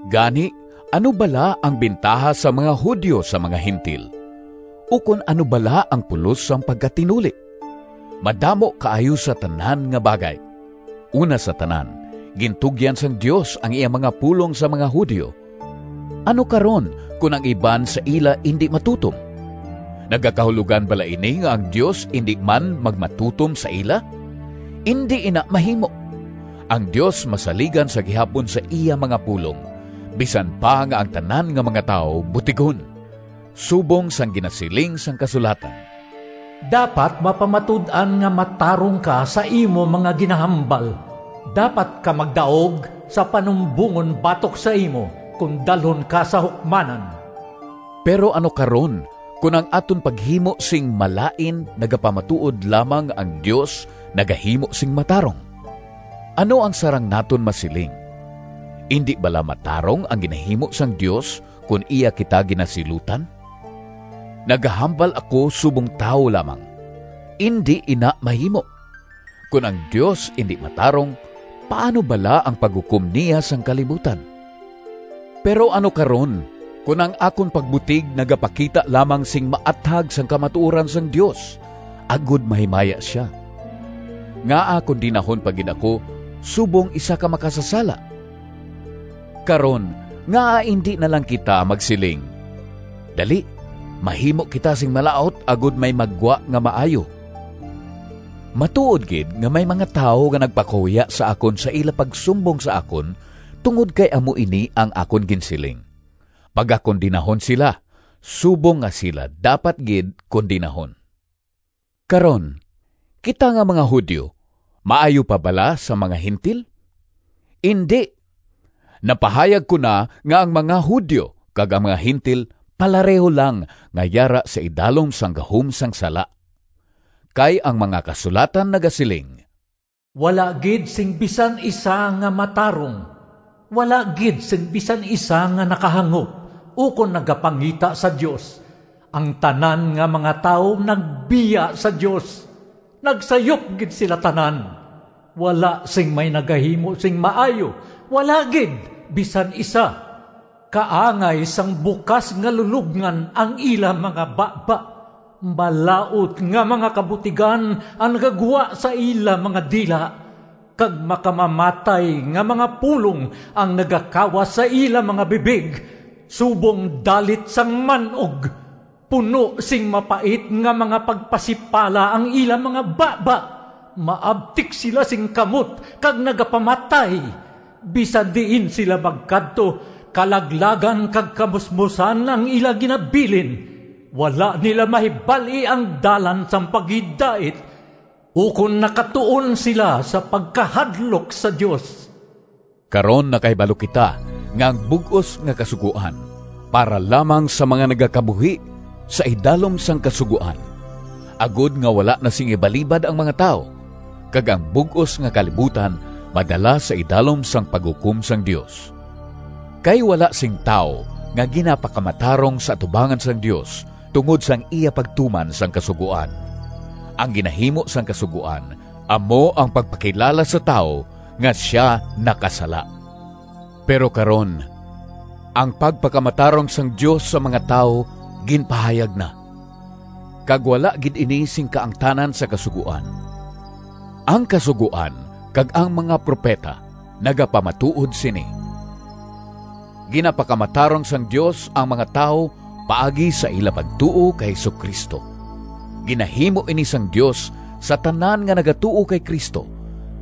Gani, ano bala ang bintaha sang mga Judio sa mga Gentil? Ukon ano bala ang pulos sang pagkatinuli? Madamo kaayo sa tanan nga bagay! Una sa tanan, gintugyan sang Dios ang iya mga pulong sa mga Judio. Ano karon, kon ang iban sa ila indi matutom? Nagakahulogan bala ini nga ang Dios indi man magmatutom sa ila? Indi ina mahimo! Ang Dios masaligan sa gihapon sa iya mga pulong, bisan pa nga ang tanan nga mga tawo butigon, subong sang ginasiling sang kasulatan: “Dapat mapamatud-an nga matarong ka Sa imo mga ginahambal; Dapat ka magdaog Sa panumbongon batok sa imo, Kon dalhon ka sa hukmanan.” Pero ano karon kon ang aton paghimo sing malain nagapamatuod lamang nga ang Dios nagahimo sing matarong? Ano ang sarang naton masiling? Indi bala matarong ang ginahimo sang Dios kon iya kita ginasilutan? (Nagahambal ako subong tawo lamang.) Indi ina mahimo! Kon ang Dios indi matarong, paano bala ang paghukom niya sang kalibutan? Pero ano karon kon ang akon pagbutig nagapakita lamang sing maathag sang kamatuoran sang Dios agod mahimaya sia? Ngaa kondenahon pa gid ako subong isa ka makasasala? Karon, ngaa indi na lang kita magsiling, “Dali, mahimo kita sing malaut agod may maggwa nga maayo”? Matuod gid nga may mga tawo nga nagpakahuya sa akon sa ila pagsumbong sa akon tungod kay amo ini ang akon ginsiling! Pagakondenahon sila, subong nga sila dapat gid kondenahon. Karon, kita nga mga Judio maayo pa bala sa mga Gentil? Indi! Napahayag ko na nga ang mga Judio kag ang mga Gentil palareho lang nga yara sa idalom sang gahom sang sala. Kay ang mga Kasulatan nagasiling: “Wala gid sing bisan isa Nga matarong, Wala gid sing bisan isa Nga nakahangop, Ukon nagapangita sa Dios. Ang tanan nga mga tawo Nagbiya sa Dios; Nagsayop gid sila tanan. Wala sing may nagahimo sing maayo, Wala gid bisan isa. Kaangay sang bukas nga lulobngan Ang ila mga baba; Malaut nga mga kabutigan Ang nagagwa sa ila mga dila, Kag makamamatay nga mga pulong Ang nagakawas sa ila mga bibig Subong dalit sang man-og; Puno sing mapait nga mga pagpasipala Ang ila mga baba. Maabtik sila sing kamot Kag nagapamatay; Bisan diin sila magkadto, Kalaglagan kag kamusmosan Ang ila ginabilin. Wala nila mahibal-i Ang dalan sang paghidait, Ukon nakatuon sila Sa pagkahadlok sa Dios.” Karon nakahibalo kita nga ang bug-os nga Kasugoan para lamang sa mga nagakabuhi sa idalom sang Kasugoan, agod nga wala na sing ibalibad ang mga tawo, kag ang bug-os nga kalibutan madala sa idalom sang paghukom sang Dios. Kay wala sing tawo nga ginapakamatarong sa atubangan sang Dios tungod sang iya pagtuman sang Kasugoan. Ang ginahimo sang Kasugoan amo ang pagpakilala sa tawo nga sia nakasala. Pero karon ang pagpakamatarong sang Dios sa mga tawo ginpahayag na, kag wala gid ini sing kaangtanan sa kasugoan. Ang Kasugoan kag ang mga propeta nagapamatuod sini: ginapakamatarong sang Dios ang mga tawo paagi sa ila pagtuo kay Jesu-Cristo. Ginahimo ini sang Dios sa tanan nga nagatuo kay Cristo,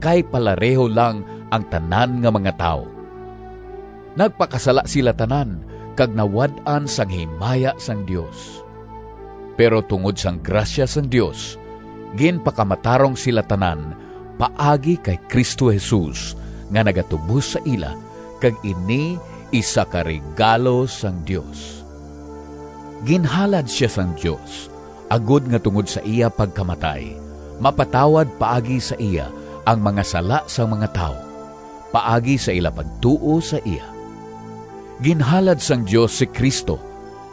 kay palareho lang ang tanan nga mga tawo: nagpakasala sila tanan kag nawad-an sang himaya sang Dios. Pero tungod sang grasya sang Dios ginpakamatarong sila tanan paagi kay Cristo Jesus nga nagatubos sa ila, kag ini isa ka regalo sang Dios. Ginhalad sia sang Dios agod nga tungod sa iya pagkamatay mapatawad paagi sa iya ang mga sala sang mga tawo, paagi sa ila pagtuo sa iya. Ginhalad sang Dios si Cristo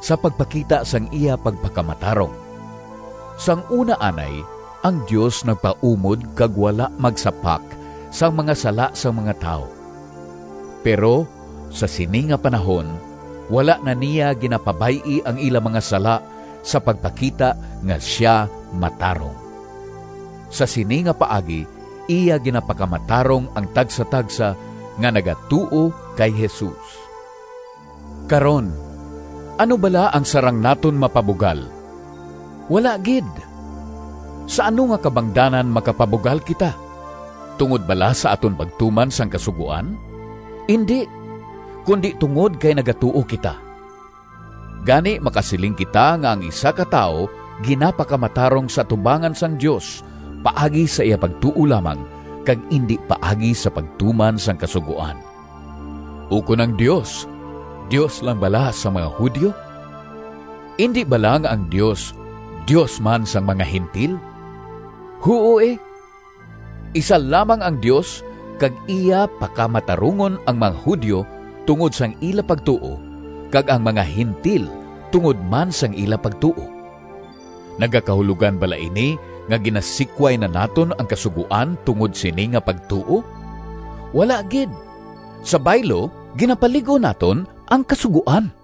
sa pagpakita sang iya pagpakamatarong. Sang una anay ang Dios nagpaumod kag wala magsapak sang mga sala sang mga tawo, pero sa sini nga panahon wala na niya ginapabay-i ang ila mga sala sa pagpakita nga sia matarong. Sa sini nga paagi iya ginapakamatarong ang tagsatagsa nga nagatuo kay Jesus. Karon, ano bala ang sarang naton mapabugal? Wala gid! Sa ano nga kabangdanan makapabugal kita? Tungod bala sa aton pagtuman sang Kasugoan? Indi, kundi tungod kay nagatuo kita. Gani makasiling kita nga ang isa ka tawo ginapakamatarong sa atubangan sang Dios paagi sa iya pagtuo lamang, kag indi paagi sa pagtuman sang Kasugoan. Ukon ang Dios, Dios lang bala sang mga Judio? Indi bala nga ang Dios, Dios man sang mga Gentil? Huo, e! Isa lamang ang Dios kag iya pakamatarungon ang mga Judio tungod sang ila pagtuo kag ang mga Gentil tungod man sang ila pagtuo. Nagakahulogan bala ini nga ginasikway na naton ang Kasugoan tungod sini nga pagtuo? Wala gid! Sa baylo, ginapalig-on naton ang Kasugoan.